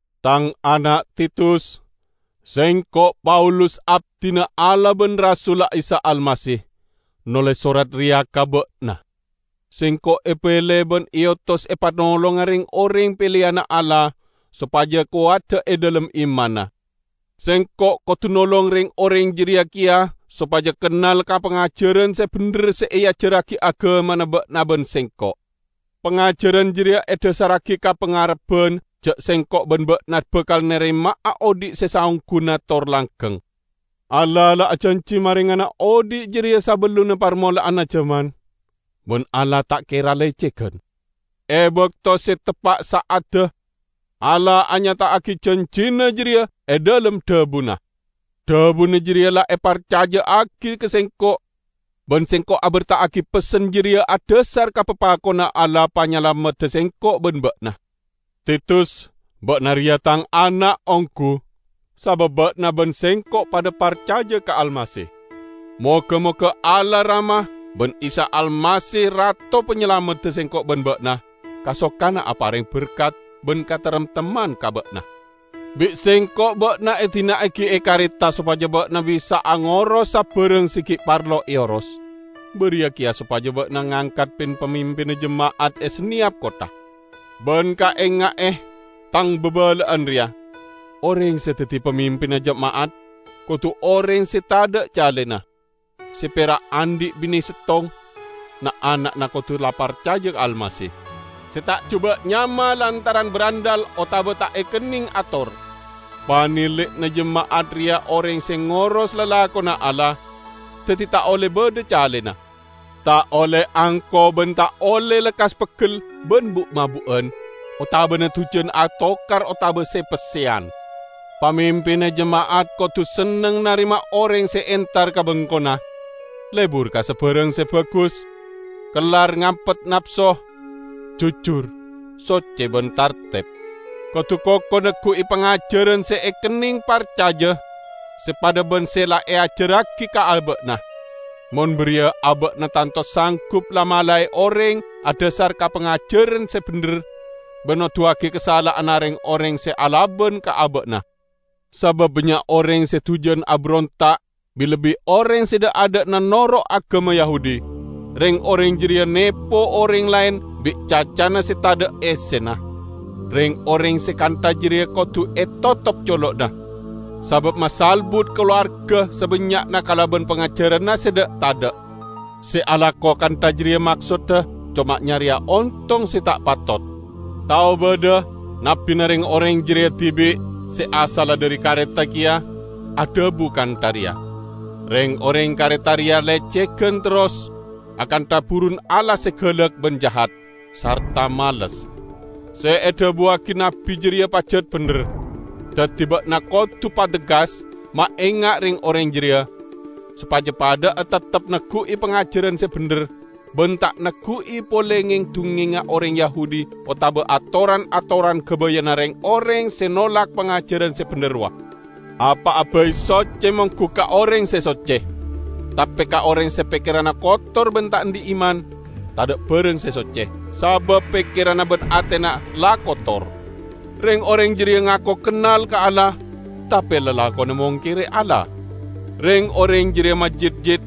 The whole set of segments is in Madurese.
Tang ana' Titus! Sengko', Paulus, abdina Allah ban rasulla Isa Almasih, noles sorat reya ka ba'na. Sengko' epele ban eotos epanolonga reng-oreng peleyanna Allah sopaja kowada e dhalem imanna. Sengko' kodu nolong reng-oreng jareya keya sopaja kennal ka pangajaran se bendher se eajarragi agamana ba'na ban sengko'. Pangajaran jareya edhasarragi ka pangarebban ja' sengko' ban ba'na bakal narema'a odhi' se saongguna tor langgeng. Allah la ajanji marengana odhi' jareya sabellunna parmola'anna jaman -- ban Allah ta' kera lecegan. E bakto se teppa' sa'adda, Allah anyata'agi janjina jareya e dhalem dhabuna. Dhabuna jareya la eparcaja'agi ka sengko'; ban sengko' aberta'agi pessen jareya adhasar ka papakonna Allah Panyalamedda sengko' ban ba'na. Titus, ba'na reya tang ana' onggu, sabab ba'na ban sengko' padha parcaja ka Almasih. Moga-moga Allah Rama ban Isa Almasih Rato Panyalamedda sengko' ban ba'na kasokana apareng berkat ban kataremtemman ka ba'na. Bi' sengko' ba'na edina'agi e Kareta sopaja ba'na bisa'a ngoros sabarang se gi' parlo eoros; bariya keya sopaja ba'na ngangkat pin-pamimpinna jema'at e saneyap kottha. Ban kaenga'e tang babala'an reya: Oreng se daddi pamimpinna jema'at kodu oreng se tadha' calena; se pera' andhi' bine settong; na'-ana'na kodu la parcaja ka Almasih, se ta' juba' nyama lantaran brandhal otaba ta' ekenneng ator. Panili'na jema'at reya oreng se ngoros lalakonna Allah, daddi ta' olle badha calena. Ta' olle angko ban ta' olle lekkas peggel ban bu'-mabu'an, otabana dujan atokar otaba se-pesseyan. Pamimpinna jema'at kodu senneng narema oreng se entar ka bengkona, lebur ka sabarang se bagus, kellar ngampet napso, jujur, socce ban tarteb. Kodu koko neggu'i pangajaran se ekenneng parcaja, se padha ban se la eajarragi ka aba'na. Mon bariya aba'na tanto sanggup la-malae oreng adhasar ka pangajaran se bendher, ban noduwagi kasala'anna reng-oreng se alaban ka aba'na. Sabab bannya' oreng se dujan aberonta', bi-lebbi oreng se dha'-adha'na noro' agama Yahudi; reng-oreng jareya nepo oreng laen bi' cacana se tadha' essena. Reng-oreng se kantha jareya kodu etotop colo'na, sabab masalbut kalowarga sabannya'na kalaban pangajaranna se dha'-tadha'. Se alako kantha jareya maksodda coma nyareya ontong se ta' patot. Tao badha nabbina reng-oreng jareya dibi', se asalla dhari Kareta keya, adhabu kantha reya, "Reng-oreng Kareta reya lecegan terros, akantha burun alas se galak ban jahat, sarta males." Se edhabuwagi nabbi jareya pajat bendher. Daddi ba'na kodu pateggas maenga' reng-oreng jareya, sopaja padha'a teptep neggu'i pangajaran se bendher ban ta' neggu'i pole ngeng-dungngengnga oreng Yahudi otaba atoran-atoran gabayanna reng-oreng se nolak pangajaran se bendher rowa. Apa'a bai socce monggu ka oreng se socce. Tape ka oreng se pekkeranna kotor ban ta' andhi' iman, tadha' barang se socce, sabab pekkeran ban atena la kotor. Reng-oreng jareya ngako kennal ka Allah, tape lalakonna mongkere Allah. Reng-oreng jareya majitjit,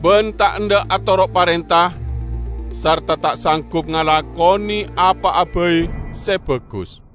ban ta' endha' atoro' parenta; sarta ta' sanggup ngalakone apa'a bai se bagus.